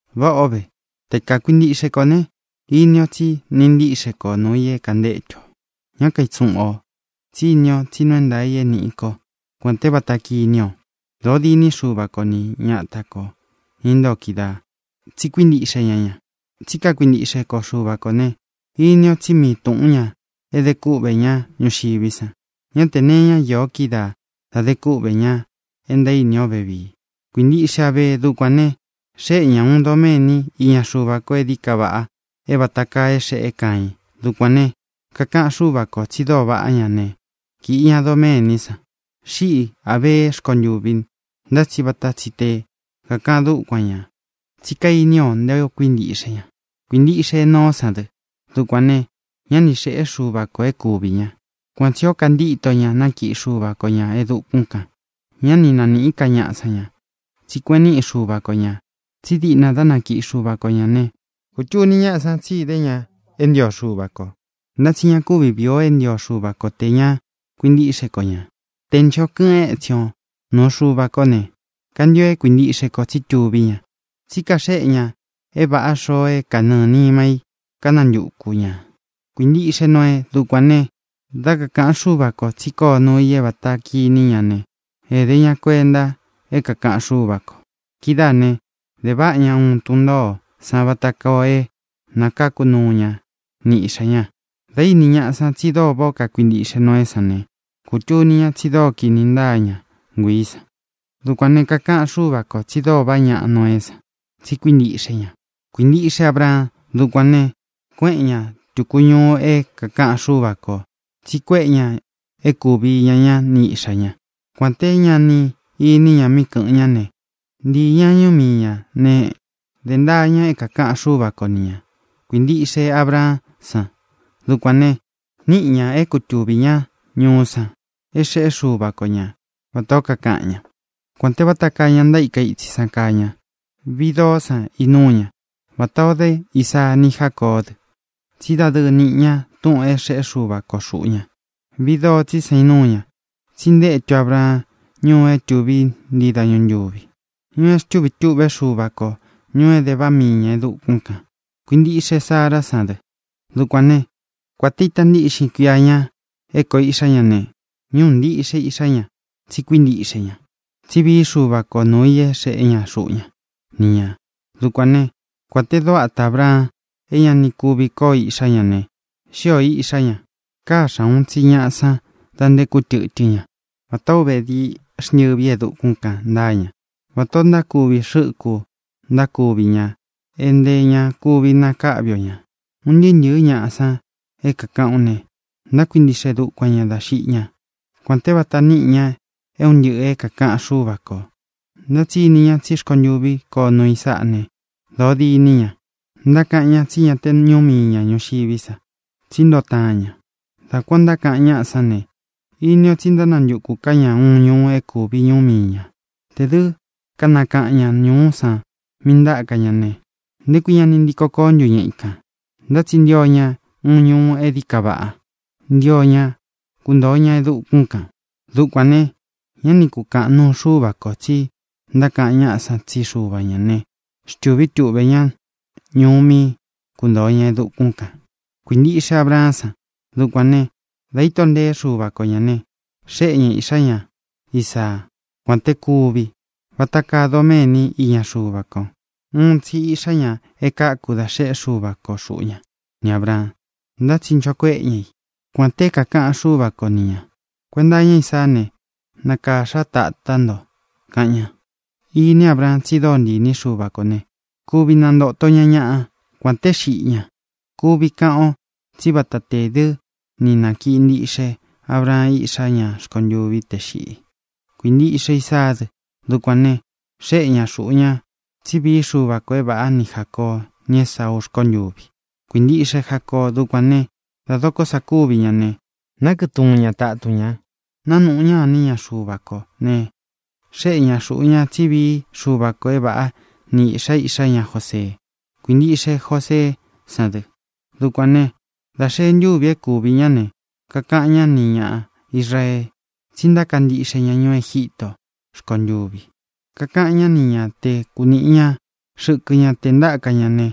Váꞌa ō ve. Te kakuintiꞌxe kō ne, ini o tsí niꞌi ntíꞌxe ko nuū i é kāntétu ō. Ñá kaitsuꞌun ō, tsí ini o tsi nuu é ntaā i é nīꞌi ko, kuān té vata kiní ō. Dōo diní Xuva ko ni ñata kō, ña intóo kídaā, tsi kuíntiꞌxe ña ña. Tsí kakuintiꞌxe ko Xuva kō ne, ini ó tsi mii tūꞌún ña e de kúꞌvē ñá ñuxiví san. Ñá tē nee iña io kídaā da de kúꞌvē ña e ntaíni o vevíi. Kuīntiꞌxe Abee. Dukuān ne, xéꞌe ña ūun doméni iña Xuva ko e dií ka vaꞌa é vāta kaa é xeꞌé Caiin. Dukuān ne, kakaꞌan Xúva kō tsi dóo vaꞌá ña ne, kīꞌi ña doméní san. Xíꞌi Ābeé rkontuvi, ntá tsi vata tsi te kākaꞌan dúkuan ñā, tsí kainí o nté ō kuíntiꞌxe ña. Kuīntiꞌxe Enoó san dɨ. Dukuān ne, ñá ni xēꞌé Xuva kō é kuvī ña. Kuan tsī ó kantíto ña nákiꞌi Xuva ko ñā e dukún kān. Ñá ni nanīꞌí ka ñaꞌa san ña, tsí kueꞌen niꞌi Xuva ko ñā. Tsí diꞌna dá nakiꞌi Xuva ko ñā né, kūtuni ñáꞌa san tsi idé ña é ntio Xuva kō. Ntá tsi ña kuvi víi ō é ntio Xuva ko tē ña kuintíꞌxe ko ñā. Te nchō kɨꞌɨn étsin o nūu Xuva kó ne, kantio é kuintiꞌxe kō tsí tuví ña, tsí kaxéꞌe ña é vāꞌa xoo é kanɨɨ̄ nima í kanantuku ñā. Kuīntiꞌxe Noee. Dukuān ne, dá kakāꞌan Xúva kō tsí koo nuu i é vāta kiní ña ne, ēde ña kuenta é kākaꞌan Xúva kō. Kidáā ne, de váꞌa ña uun tun ntōó san vata koo é nakáku nuu ña ni iꞌxā ña. Dā íni ñaꞌa san tsi dóo váꞌā ó kakuintiꞌxe Noeé san ne, kūtuni ña tsi dóo kini ntáa ña nguiī san. Dukuān ne, kakaꞌan Xúva kō tsi dóo vaꞌá ñaꞌa Noeé san, tsi kuíntiꞌxe ña. Kuīntiꞌxe Abraan. Dukuān ne, kuéꞌen ña tūku ñuu é kākaꞌan Xúva kō tsi kuéꞌe ña é kūvi iña ñá ni iꞌxā ña. Kuān té ña ni iní ña míꞌi kɨ̄ꞌɨn ñá ne, ntīi ña ñuú mii ñā ne, dē ntaa ña é kākaꞌan Xúva ko ni ñā. Kuīntiꞌxe Abraán san. Dukuān ne, níꞌi ña é kutuvī ñá ñuú san é xeꞌé Xuva ko ña vatā ó kakaꞌan ñá, kuān te váta kaa ña ntaíka itsi san kaa ña. Viꞌi doó san inúu ña, vatā o dé Isaa ni Jácoó dɨ, tsí dadɨɨ níꞌi ña túꞌūn é xeꞌé Xuva ko xūꞌu ña. Viꞌi doo tsí san inúu ña, tsí intétu Abraan ñuu é tuví ntii dañu ntūvi, ñuu é xtúvi tūꞌvé Xuva kō, ñuu é de váꞌa mii ñā e dukún kān. Kuīntiꞌxe Sará san dɨ. Dukuān né, kuān te ita ntíꞌxin kuia ña é kōo iꞌxá ña ne, ñúꞌū ntiꞌxe iꞌxá ña, tsi kuíntiꞌxe ña tsi vií Xuva ko nuū i é xeꞌé ña xuꞌu ña ni ñā. Dukuān né, kuān te dóo ata Ābraan é ña ni kuvi kóo iꞌxá ña ne, xíō iꞌxá ña. Káxa ūun tsi ñaꞌa san da nté kútɨtɨ́n ña. Vatā ó uve dií xntɨvi e dukún kān ntáa ña. Vatā ó ntákuvi xɨ́ku ntákuvi ña é ntē ña kuvi nakáꞌvi o ñā. Un ntɨɨ́ ntɨ̄ɨ́ ñaꞌa san é kākaꞌán u ne, ntákuintiꞌxe dukuan ñā dá xiꞌi ñá, kuān té vata níꞌi ña é un ntɨꞌɨ̄ é kākaꞌan Xúva kō. Ntá tsi ini ñá tsi rkontuví koo nuu i sáꞌa ne, dōo diní ña. Ntákaꞌan ñá tsi ña te ñuú mii ña ñūxiví sa, tsí ntoo taan ña. Dá kuān ó ntákaꞌan ñáꞌa sán ne, ini ó tsi ntánantukū ká ña uun ñuu é kūvi ñuú mii ñā. Tē dɨ́ kanakaꞌan ña ñūú san míꞌī ntáka ña ne, ¿nté kui ña ni ntiko koó ntu ña ikān? Ntá tsi ntio ña uun ñuu é dií ka vaꞌa. Ntio ña kuntōo ña e dukún kān. Dukuān ne, ñá ni kūkaꞌan nuu Xúva kō tsi ntákaꞌan ñáꞌa san tsí Xuva ñā né, xtūví tuꞌvē ñá ñuú mí kuntōo ña e dukún kān. Kuīntiꞌxe Abraán san. Dukuān né, dā íto ntēé Xuva ko ñā ne, xéꞌe ñā iꞌxá ña Isaá, kuān té kuví, vata kaa doméni iña Xuva ko. Uun tsi iꞌxá ña e káku dá xeꞌé Xuva ko xuꞌu ña ni Ābraan, ntá tsi nchō kuéꞌe ña i, kuān te é kākaꞌan Xúva ko ni ñā: “Kuenta iña Ísaá ne, nakāxa tátá nto”, kaꞌan ña. Ini Ábraan tsi dóo ntii īní Xuva kō ne, kuvi nantoto ña ñaꞌa kuān té xiꞌi ña. Kuvi kaꞌan o tsí vata tē dɨ́ ni nākiꞌi ntiꞌxe Abraan íꞌxá ña rkontuvi te xiꞌi. Kuīntiꞌxe Isaá dɨ. Dukuān ne, xéꞌe ñā xuꞌu ña tsí vií Xuva kō é vāꞌá ni Jācoo, ni Esáuú rkontuvi. Kuīntiꞌxe Jacoo. Dukuān né, dā dokó sa kúvi ña ne, nákɨꞌɨ̄ tuun ña tatun ña. Nānuꞌu ña iní ña Xuva kō ne, xéꞌe ñā xuꞌu ña tsí vií Xuva kō é vāꞌá ni īꞌxa iꞌxá ña Josee. Kuīntiꞌxe Joseé san dɨ. Dukuān né, dā xee ntúvi é kuvī ñá ne, kakaꞌan ñá nī ña Israee tsí ntaka ntiꞌxe ña ñuú Egítō rkontuvi. Kakaꞌan ñá ni ña te kūniꞌi ña xɨkɨ ña te ntáka ña ne,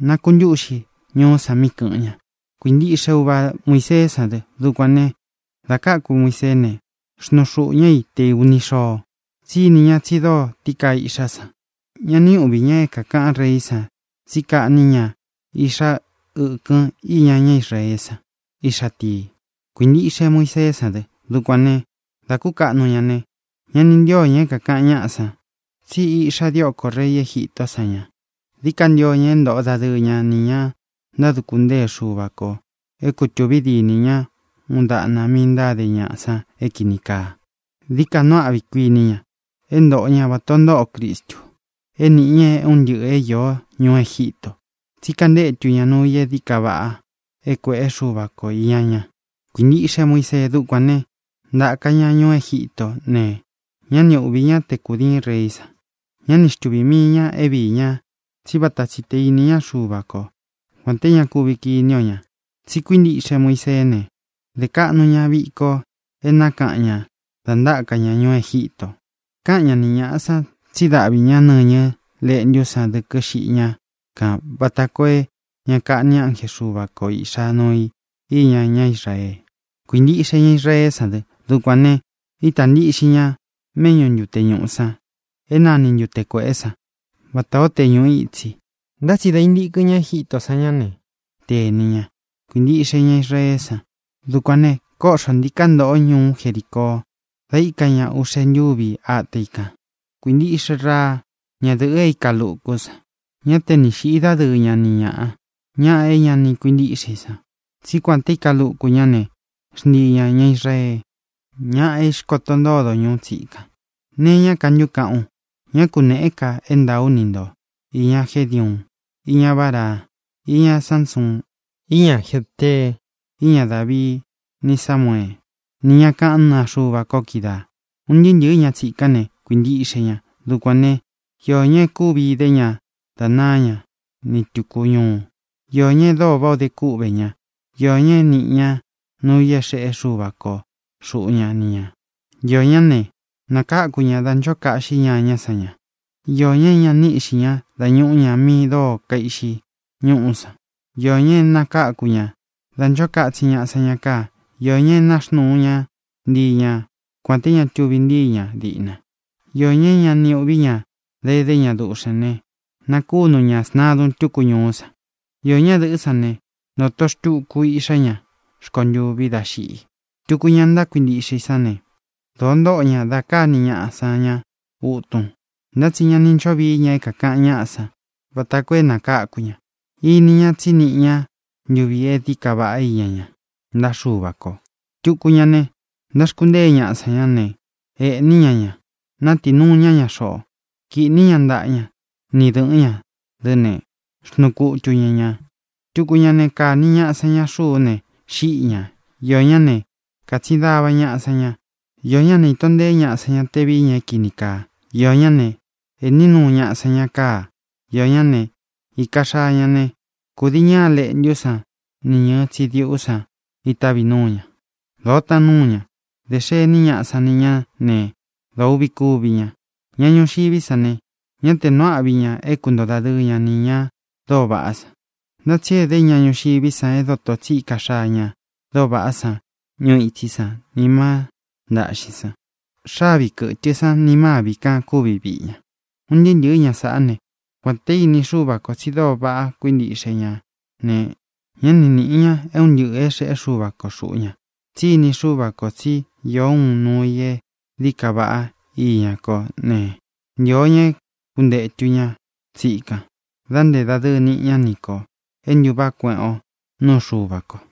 nakuntúꞌxi ñuú san mí kɨ̄ꞌɨn ña. Kuīntiꞌxe uva Muiseé san dɨ. Dukuān né, dā káku Muiseé ne, xnuu xūꞌu ñá i te ūni xoo, tsí ini ña tsi dóo tií kaa iꞌxá san. Ñá ni uꞌvī ña é kākaꞌan reí san tsi kaꞌní ña iꞌxa ɨ́kɨ́n iña ñá Israeé san, iꞌxa tii. Kuīntiꞌxe Muiseé san dɨ. Dukuān né, dā kúkaꞌnu ña ne, ña ni ntío ña é kākaꞌan ñáꞌa san tsí iꞌxa diókō rei Egítō san ña. Dií ka ntio ña é ntoꞌo dadɨɨ ña nī ña ntáduku ntée Xuva kō é kutūvi dínī ña uun daꞌna mí ntáde ñaꞌa san é kīni kaa. Dií ka nuu áꞌvi, kuiní ña, é ntōꞌo ñá vata ō ntóꞌo Cristu é nīꞌi ña é un ntɨꞌɨ̄ é īó ñuú Egítō. Tsí kantetu ña nuu i e dií ka vaꞌa é kuēꞌé Xuva ko īña ña. Kuīntiꞌxe Muisee. Dukuān né, ntāka ña ñuú Egítō ne, ñá ni uꞌvī ñá te kūdiín reí san. Ñá ni xtuvī mii ña é viī ña, tsí vata tsi tē íni ña Xuva ko, kuān té ña kuvi kiní o ñā. Tsi kuíntiꞌxe Muiseé ne, dē kaꞌnu ña viko é nakaꞌan ñā da ntáka ña ñuú Egítō. Kāꞌan ñá ni ñāꞌa san tsí daꞌví ña nɨñɨ léꞌntú san dɨkɨ́ xiꞌi ña kan vata koo é ña kaꞌni ánje Xuva ko īꞌxa nuu i íña ñá Israee. Kuīntiꞌxe ña Israeé san dɨ. Dukuān ne, ítā ntiꞌxin ña méꞌñū ntute ñuꞌu san é nani Ntute Kuēꞌé san vatā ó te ñuꞌu itsi. Ntá tsi dā intíkɨn ña Egítō sán ña ne, tēni ña. Kuīntiꞌxe ña Israeé san. Dukuān ne, kóꞌxo ntīká ntoꞌo ñuú Jericoo da íka ña uꞌxe ntúvi ata i kan. Kuīntiꞌxe Raa, ñádɨ̄ꞌɨ e íka lukú san. Ñá te ni xīꞌi dádɨɨ ña ni ñāꞌa, ña é ña ni kuintíꞌxe i san, tsí kuān te íka luku ñá ne, xntii ñā ña Israee, ña é īxkoto ntódo ñuú tsikan. ¿Nēe iñá ka ntu kaꞌán u? Ñá kunēꞌé ka é ntāa ú ni nto īña Gédiuun, iña Báraa, iña Sánsuun, iña Jéftee, iña Dávii ni Sámuee, ni ñá kaꞌán naa Xuva ko kídaā. Un ntɨɨ́ ntɨ̄ɨ́ ña tsikán ne, kuīntiꞌxe ña. Dukuān né, iō ñá e kúvi idé ña da náa ña ni tūku ñuu. Iō ñá e dóo váꞌā o de kúꞌvē ña. Iō ña é niꞌi ña núu ī é xeꞌé Xuva ko xuꞌu ña ni ñā. Iō ñá ne, nakáku ña dá ncho kaꞌxí ñañá san ña. Iō ña é ñā ni íꞌxi ña dá ñūꞌu ña mi dóo kaiꞌxi ñúꞌú san. Iō ña e nakáku ña da nchó katsin ñaꞌa san ña káa. Iō ña e náxnuu ña ntii ña kuān té ña tuvi ntíi ña diꞌna. Iō ña é ña ni uꞌví ña dá edé ña duꞌxēn né, nakúnu ñā sntadun túku ñuú san. Īó ñadɨ̄ꞌɨ́ san ne, ntōto xtuku iꞌxá ña rkontuvi dá xiꞌi. Tuku ña ntákuintiꞌxe i sán ne, dōo ntóꞌo ña da káni ñaꞌa san ña utun, ntá tsi ña ni ncho víi ña é kākaꞌan ñáꞌa san vata koo é nakáku ña. Ini ñá tsi niꞌi ña ntuvi e dií ka vaꞌá iña ña ntaꞌa Xúva kō. Tuku ña ne, ntáxkuntée ñaꞌa san ña ne, ēꞌní ña ña, nátiī nuu ña ña xoꞌo. Kīꞌní ña ntaꞌa ña ni dɨ̄ꞌɨ́n ña dɨ́ ne, xnuu kutu ña ñā. Tuku ña ne, kāni ñaꞌa san ña xuú ne, xíꞌi ñā. Iō ñá ne, kātsin dava ñaꞌa san ña. Iō ñá ne, īto nteé ñaꞌa san ña te vií ña é kīni kaa. Iō ñá ne, ēꞌní nuu ñaꞌa san ña káa. Iō ñá ne, īka xaa ña ne, kudii ñɨɨ́ a leꞌntú san ni ñɨ̄ɨ tsidiꞌú san itávi núu ña. Dōo taan núu ña. Dē xení ñaꞌa san ni ñá ne, dōo uꞌvi kúvi ña. Ña ñuxiví san ne, ñá te nuu áꞌvi ña é kuntoo dadɨɨ ña nī ña dóo vaꞌá san. Ntá tsi edé ña ñuxiví san é doto tsi íka xaa ña dóo vaꞌá san ñuu itsí san nī má ntāꞌxín san. Xavi kɨ́tɨ san ni mâvi kan kúvi viꞌi ña. Un ntɨɨ́ ntɨ̄ɨ́ ña saꞌá ne, kuān te íni Xúva kō tsi dóo vaꞌá kuintiꞌxe ña ne, ñá ni nīꞌi ña é un ntɨꞌɨ̄ é xeꞌé Xuva ko xūꞌu ña. Tsí ini Xúva kō tsi ío ūun nuu i é dií ka vaꞌá iñá kō ne, ntio ña é kūntetu ña tsikan da nté dadɨɨ niꞌi ña ni kō e ntuváꞌa kueꞌen o nuú Xuva kō.